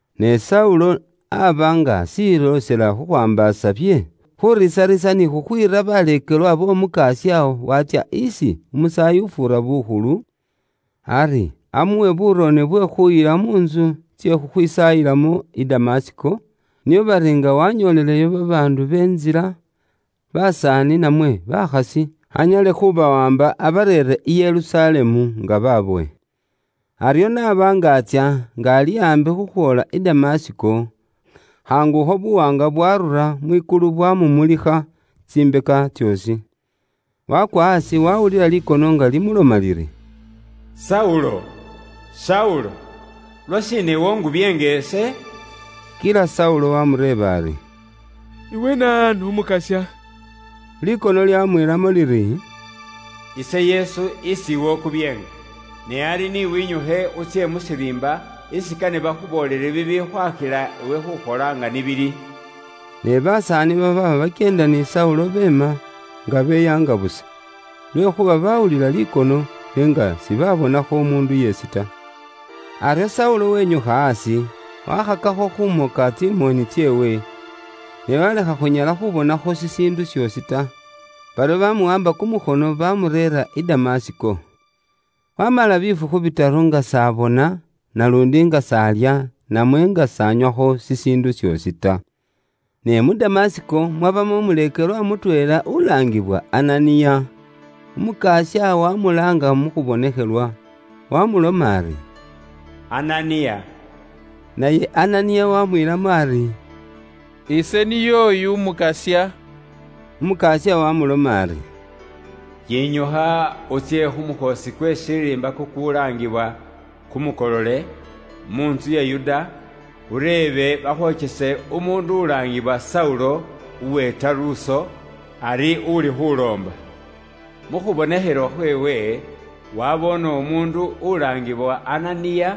Ne Saulo aba nga ashiloosela khukhwaambaasa bye khuriisariisa ni khukhwiira baleekelwa b'Omukasya Watsya isi umusaayi ufuura bukhulu, ari amuwe buurone bwe khuyila mu ntsu tsye khukhwisaayilamo i Damasiko, nio bari nga wanyooleleyo babaandu be Ntsila, basaani namwe bakhasi anyale khubawaamba abareere i Yerusalemu nga babowe. Aryo n'aba nga atsya, nga ali aambi khukhwoola i Damasiko, khaangukho buwaanga bwaarura mwikulu bwamumulikha tsimbeka tsoosi. Waakwa aasi wawulila likono nga limuloma liri, “Saulo! Saulo, lwashiina iwe ungubyeenga ise?” Kila Saulo waamureeba ari, “Iwe naanu, Umukasya?” Likono lyamwiilamo liri, “Ise Yesu isi iwe ukubyeenga. Ne ari ni winyukhe utsye mu shiriimba, isi kane bakhuboolele bibikhwakhila iwe khukhola nga ni bili.” Ne basaani babaaba bakyeenda ni Saulo beema, nga beyaanga busa. Lwekhuuba baawulila likono, n'enga sibabonakho umuundu yeesi ta. Aryo Saulo wenyukha aasi, wakhakakho khumoka tsimoni tseewe, ne walekha khunyala khubonakho shishiindu shoosi ta. Baryo bamuwaamba kumukhono bamureera i Damasiko. Wamala bifukhu bitaru nga s'abona naluundi nga s'alya namwe nga s'anywakho shishiindu shoosi ta. Ne mu Damasiko mwabamo umuleekelwa mutweela ulaangiwa Ananiya. Umukasya waamulaanga mu khubonekhelwa, waamuloma ari, “Ananiya.” Naye Ananiya waamwiilamo ari, “Ise niy'oyu, Umukasya.” Umukasya waamuloma ari, “Yinyukha utsye khu mukhoosi kwe shiriimba kukulaangibwa Kumukolole, mu ntsu ya Yuda, ureebe bakhwokyese umuundu ulaangibwa Saulo uwe Taruso. Ari uli khuloomba. Mu khubonekhelwa khweewe waboone umuundu ulaangibwa Ananiya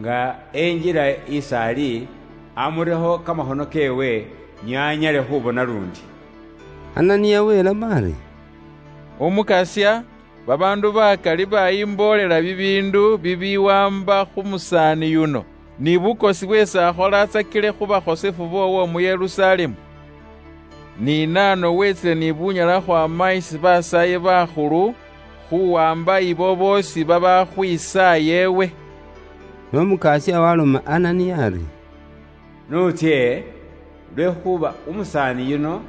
nga enjila is'ali, amurekho kamakhono keewe, nio anyale khubona luundi.” Ananiya welamo ari, “Umukasya, babaandu bakali bayimboolela bibiindu bibiwaamba khu musaani yuno, ni bukosi bweesi akholatsakile khu bakhosefu boowo mu Yerusalemu. Ni na ano wetsile ni bunyala khukhwaama isi basaayi bakhulu khuwaamba ibo boosi babaakhwisaaya iwe.” Ne Umukasya waloma Ananiya ari, “N'utsye, lwekhuuba umusaani yuno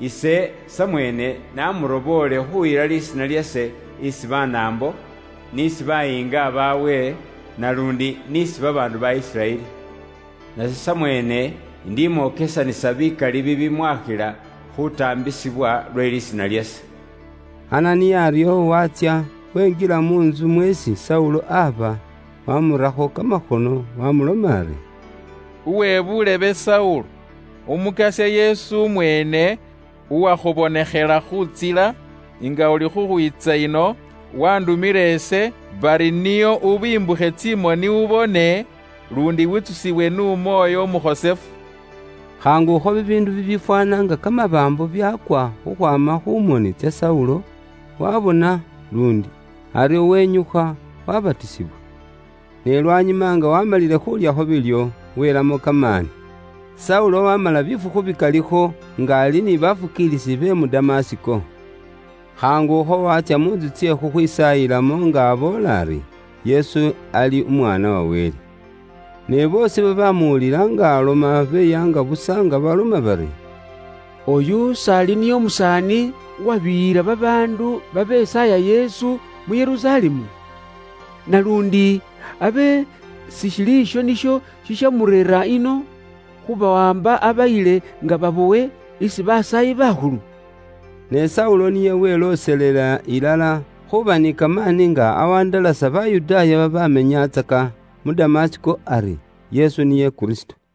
ise samweene naamuroboole khuyila lisiina lyase isi Banaambo, n'isi bayiinga baabwe, naluundi n'isi babaandu ba Isiraeli. Nase samweene indimwokesanisa bikali bibilimwakhila khutaambisibwa lwe lisiina lyase.” Ananiya aryo waatsya, wenjila mu ntsu mweesi Saulo aba, waamurakho kamakhono, waamuloma ari, “Uwe buulebe Saulo, Umukasya Yesu umweene, uwakhubonekhela khu ntsila nga uli khukhwiitsa ino, waandumile ise bari nio ubimbukhe tsimoni ubone, luundi witsusiwe n'Umwoyo Umukhosefu.” Khaangukho bibiindu bibifwaana nga kamabaambu byaakwa khukhwaama khu moni tsa Saulo, waabona luundi. Aryo wenyukha waabatisibwa. Ne lwanyuma nga waamalile khuulyakho biilyo, wiilamo kamaani. Saulo aboolela Kamakhuuwa Kamalayi mu Damasiko Saulo waamala bifukhu bikalikho nga ali ni baleekelwa be mu Damasiko. Khaangukho watsya mu ntsu tsye khukhwisaayilamo nga aboola ari, “Yesu ali Umwaana wa Wele.” Ne boosi babamuwulila nga aloma beyaanga busa nga baloma bari, “Oyu s'ali niye umusaani uwabiyila babaandu babesaaya Yesu mu Yerusalemu? Naluundi abe sishili isho nisho shishamureera ino khubawaamba, abayile nga babowe isi basaayi bakhulu?” Ne Saulo niye welooselela ilala khuuba ni kamaani nga awandalasa Bayudaaya babamenyatsaka mu Damasiko ari, Yesu niye Kristo.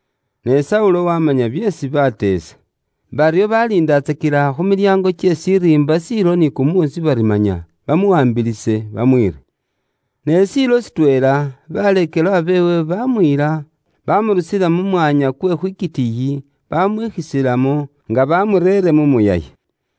Ne Saulo wamanya byeesi baateesa. Baryo baliindatsakila khu milyango kye shiriimba shiilo ni kumuusi bari manya bamuwaambilise bamwiire. Ne shiilo shitweela, baleekelwa beewe baamuyila, bamurusila mu mwanya kwe khwitikiiyi, bamwikhisilamo nga bamureere mu muyayi.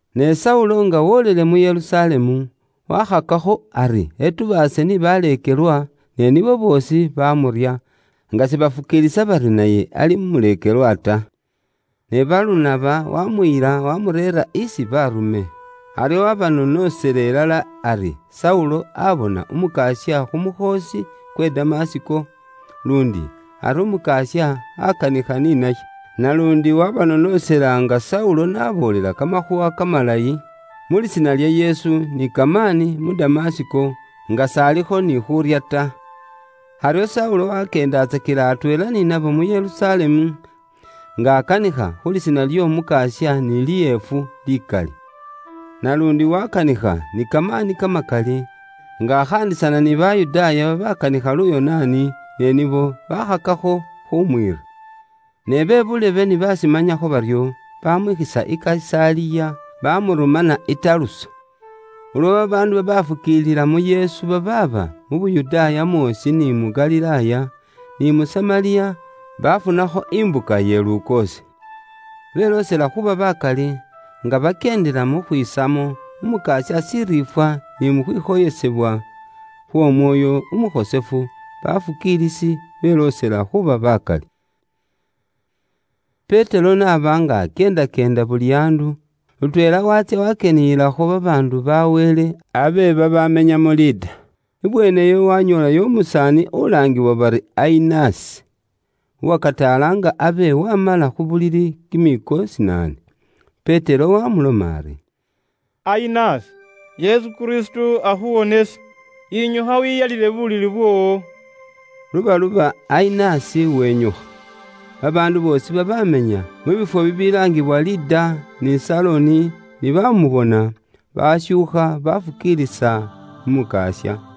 Ne Saulo nga wolele mu Yerusalemu, wakhakakho ari etubaase ni baleekelwa, ne nibo boosi bamurya, nga sibafukiilisa bari naye ali umuleekelwa ta. Ne Balunaba waamuyila, waamureera isi baarume. Aryo waabanoonosela ilala ari Saulo aabona Umukasya khu mukhoosi kwe Damasiko, luundi ari Umukasya aakanikha ni naye. Naluundi waabanoonosela nga Saulo n'aboolela Kamakhuuwa Kamalayi mu lisiina lya Yesu ni kamaani mu Damasiko, nga s'alikho ni khuurya ta. Aryo Saulo wakyeendatsakila atweela ni nabo mu Yerusalemu, nga akanikha khu lisiina ly'Omukasya ni liefu likali. Naluundi wakanikha ni kamaani kamakali, nga akhaandisana ni Bayudaaya babakanikha Luyonaani, ne nibo bakhakakho khumwiira. Ne be buulebe ni bashimanyakho baryo, bamwikhisa i Kayisaliya, bamurumana i Taruso. Ulwo babaandu babaafukiilila mu Yesu babaaba mu Yuda mwoosi ni mu Galilaaya, ni mu Samariya, baafunakho mbuka iye lukoosi. Beloosela khuuba bakali, nga bakyeendela mu khwisamo Umukasya shiriifwa ni mu khwikhoyesebwa khw'Omwoyo Umukhosefu, bafukiilisi beloosela khuuba bakali. Petero n'aba nga akyeendakyeenda buli andu, lutweela waatsya wakyeniyilakho babaandu bakhosefu ba Wele abe babaamenya mu Lida. Ibweeneyo waanyoolayo umusaani ulaangiwa bari Ayinasi uwakataala nga abe waamala khu bulili kimiiko shinaane. Petero waamuloma ari, “Ayinasi, Yesu Kristo akhuwonesa. Yinyukha wiyalile bulili bwoowo.” Lubaluba Ayinasi wenyukha. Babaandu boosi babaamenya mu bifwo bibilaangibwa Lida ni Saloni ni bamubona, bashuukha bafukiilisa mu Mukasya.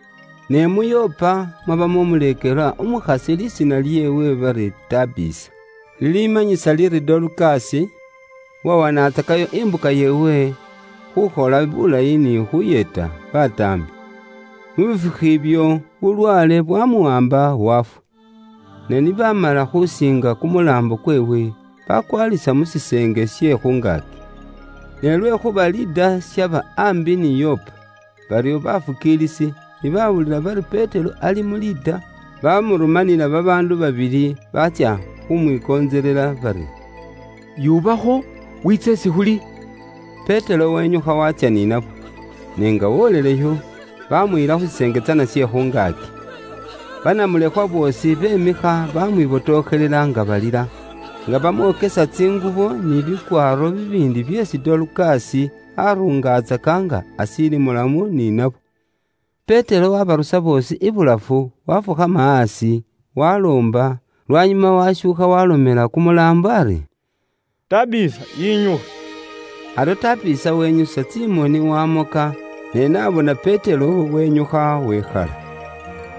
Ne mu Yopa mwabamo umuleekelwa umukhasi lisiina lyeewe bari Tabisa, lilimanyisa liri Dorukasi, uwawanatsakayo imbuka yeewe khukhola bilayi ni khuyeeta bataambi. Mu bifukhu ibyo, bulwaale bwamuwaamba waafwa. Ne ni baamala khusiinga kumulaambo kweewe, bakwalisa mu shiseenge she khungaaki. Ne lwekhuuba Lida shaba aambi ni Yopa, baryo baleekelwa ni baawulila bari Petero ali mu Lida, bamurumanila babaandu babili baatsya khumwikontselela bari, “Yuubakho, wiitse isi khuli.” Petero wenyukha watsya ni nabo. Ne nga woleleyo, baamuyila mu shiseenge tsana she khungaaki. Banamulekhwa boosi bemikha bamwibotokhelela nga balila, nga bamwokesa tsingubo ni bikwaaro bibiindi byeesi Dorukasi aruungatsaka nga ashiili mulamu ni nabo. Petero waabarusa boosi ibulafu, waafukhama aasi, waaloomba, lwanyuma waashuukha waalomela kumulaambo ari, “Tabisa yinyukha.” Aryo Tabisa wenyusa tsimoni waamoka, ne n'abona Petero wenyukha wekhala.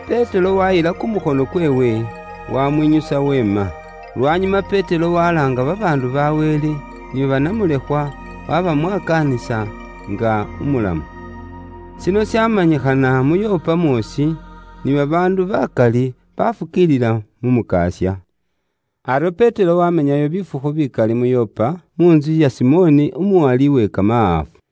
Petero waayila kumukhono kweewe, waamwinyusa weema. Lwanyuma Petero walaanga babaandu bakhosefu ba Wele, ni banamulekhwa, waabamwakaanisa nga umulamu. Shino shamanyikhana mu Yopa mwoosi, ni babaandu bakali bafukiilila mu Mukasya. Aryo Petero wamenyayo bifukhu bikali mu Yopa, mu ntsu ya Simoni abe uwala kamahaafu.